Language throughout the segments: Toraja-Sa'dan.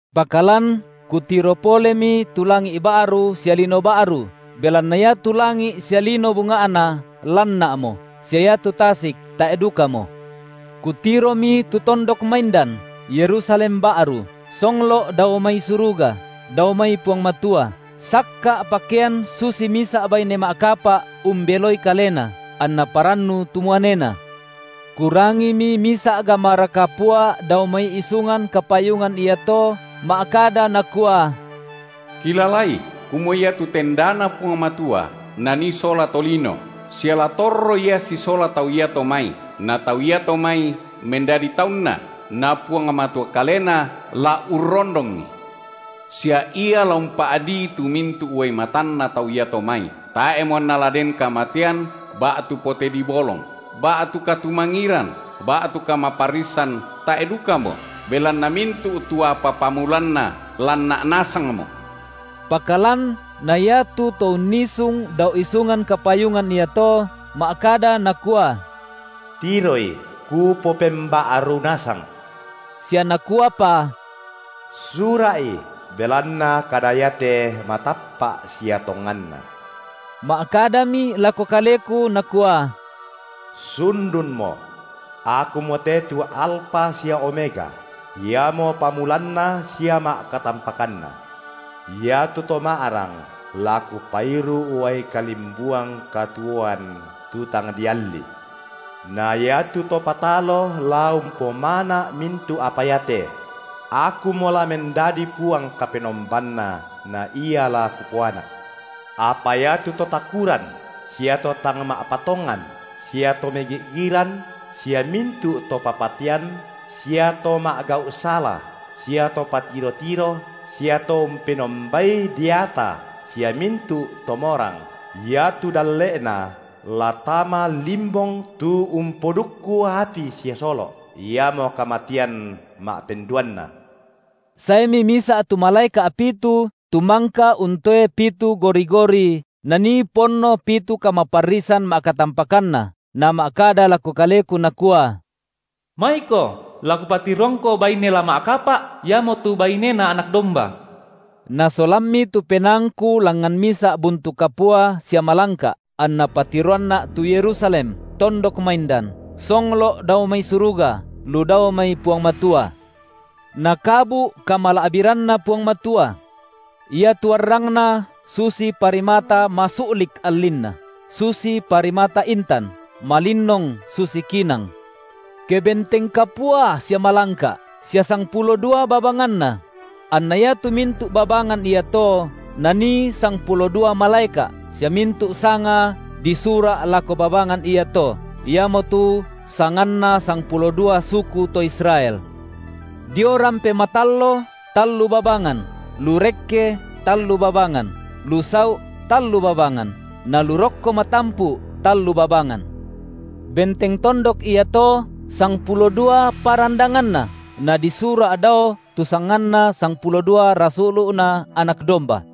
Pakalan kutiro polemi tu langi’ ba’ru sia lino ba’ru, belanna iatu langi’ sia lino bunga’na lanna’mo, sia iatu tasik tae’ dukamo. Kutiromi tu tondok maindan, Yerusalem ba’ru, songlo’ dao mai suruga, dao mai Puang Matua, sakka’ pakean susi misa’ baine ma’kapa’ umbeloi kalena, anna parannu tu muanena. Kurangimi misa’ gamara kapua dao mai isungan kapayungan iato ma’kada nakua: Kilalai kumua iatu tendaNa Puang Matua nanii sola tolino, sia la torro Ia sisola tau iato mai, na tau iato mai mendadi taunNa, na Puang Matua Kalena la urrondongi. Sia Ia la umpa’dii tu mintu’ uai matanna tau iato mai, tae’mo anna la den kamatean ba’tu pote dibolong, ba’tu katumangiran ba’tu kamaparrisan tae’ dukamo, belanna mintu’ tu apa pamulanna lanna’ nasangmo. Pakalan na iatu To unnisung dao isungan kapayungan iato, ma’kada Nakua: Tiroi, Kupopemba’ru nasang. Sia Nakuapa: Sura’i, belanna kada iate matappa’ sia tonganna. Ma’kadami lako kaleku Nakua: Sundunmo. Akumote tu Alfa sia Omega, iamo pamulanna sia ma’katampakanna. Iatu to ma’rang la Kupairu’ uai kalimbuang katuoan, tu tang dialli. Na iatu to patalo la umpomana’ mintu’ apa iate; Akumo la mendadi Puang Kapenombanna na ia la Kupoanak. Apa iatu to takuran sia to tang ma’patongan sia to megi’giran, sia mintu’ to papatean, sia to ma’gau’ sala, sia to patiro-tiro, sia to umpenombai deata sia mintu’ to morang, iatu dalle’na la tama limbong tu umpodukku api sia solo’, iamo kamatean ma’penduanna. Saemi misa’ tu malaeka’ pitu tu mangka untoe pitu gori-gori nanii ponno pitu kamaparrisan ma’katampakanna, nama’kada lako kaleku nakua: Maiko, la kupatiroangko baine la ma’kapa’, iamotu baineNa Anak domba. Nasolammi tu penaangku langngan misa’ buntu kapua sia malangka’, anna patiroanna’ tu Yerusalem, tondok maindan, songlo’ dao mai suruga lu dao mai Puang Matua. Nakabu’ kamala’biranNa Puang Matua. Iatu arrangna susi parimata masu’lik allinna, susi parimata intan, malinnong susi kinang. Kebenteng kapua sia malangka’, sia sangpulo dua babanganna; anna iatu mintu’ babangan iato nanii sangpulo dua malaeka’, sia mintu’ sanga disura’ lako babangan iato, iamotu sanganna sangpulo dua suku to Israel. Dio rampe matallo tallu babangan, lu rekke tallu babangan, lu sau’ tallu babangan, na lu rokko matampu’ tallu babangan. Benteng tondok iato sangpulo dua parandanganna, nadisura’ dao tu sanganna sangpulo dua rasulu’Na Anak domba.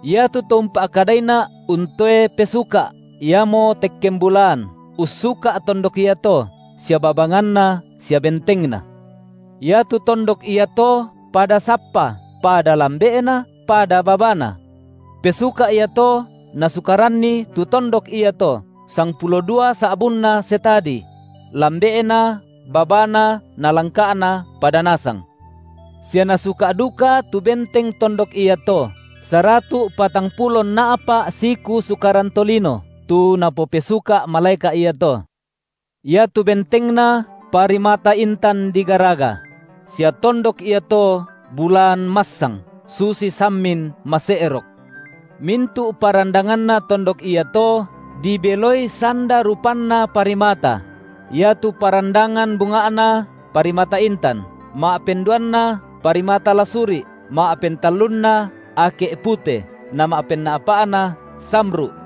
Iatu to umpa’kadaina’ untoe pesuka’, iamo tekken bulaan, ussuka’ tondok iato sia babanganna sia bentengna. Iatu tondok iato pada sappa, pada lambe’na, pada babana. Pesuka’ iato nasukaranni tu tondok iato, sangpulo dua sa’bunna setadi; setadi duaratu’ metere’ lambe’na. lambe’na babana na langka’na pada nasang. Sia nasuka’ duka tu benteng tondok iato saratu’ patangpulo nna’pa’ siku sukaran tolino, tu napopesuka’ malaeka’ iato. Iatu bentengna, parimata intan digaraga; sia tondok iato bulaan massang, susi sammin mase’rok. Mintu’ parandanganna tondok iato dibeloi sanda rupanna parimata; iatu parandangan bunga’na parimata intan, ma’penduanna parimata lasuri’, ma’pentallunna ake’ pute, na ma’penna’pa’na samru’,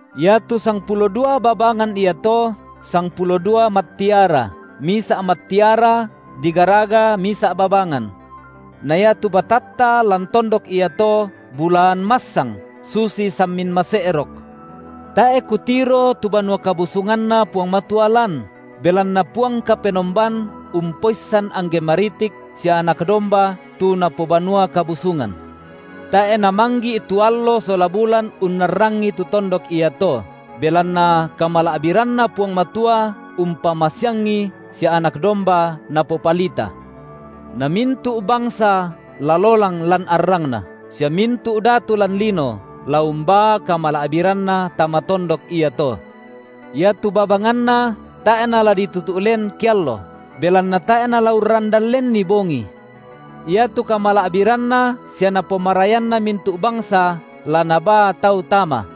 Iatu sangpulo dua babangan iato sangpulo dua mattiara; misa’ mattiara digaraga misa’ babangan. Na iatu batatta lan tondok iato bulaan massang susi sammin mase’rok. Tae’ kutiro tu banua kabusunganNa Puang Matua lan, belanna Puang Kapenomban, Umpoissan angge maritik sia Anak domba tu napobanua kabusungan. Tae’ namanggi’ tu allo sola bulan unnarrangi tu tondok iato, belanna kamala’biranNa Puang Matua umpamasiangi sia Anak domba napopalita. Na mintu’ bangsa la lolang lan arrangna, sia mintu’ datu lan lino la umbaa kamala’biranna tama tondok iato. Iatu babanganna tae’ nala ditutu’ len keallo, belanna tae’ nala urrandan lenni bongi. Iatu kamala’biranna sia napomarayanna mintu’ bangsa la nabaa tau tama.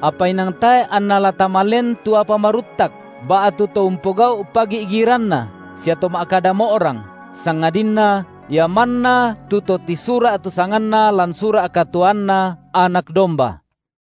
Apa inang tae’ anna la tama len tu apa maruttak, ba’tu to umpogau’ pagi’giranna sia to ma’kada mo’rang, sangadinna ia manna tu to tisura’ tu sanganna lan sura’ katuoanNa Anak domba.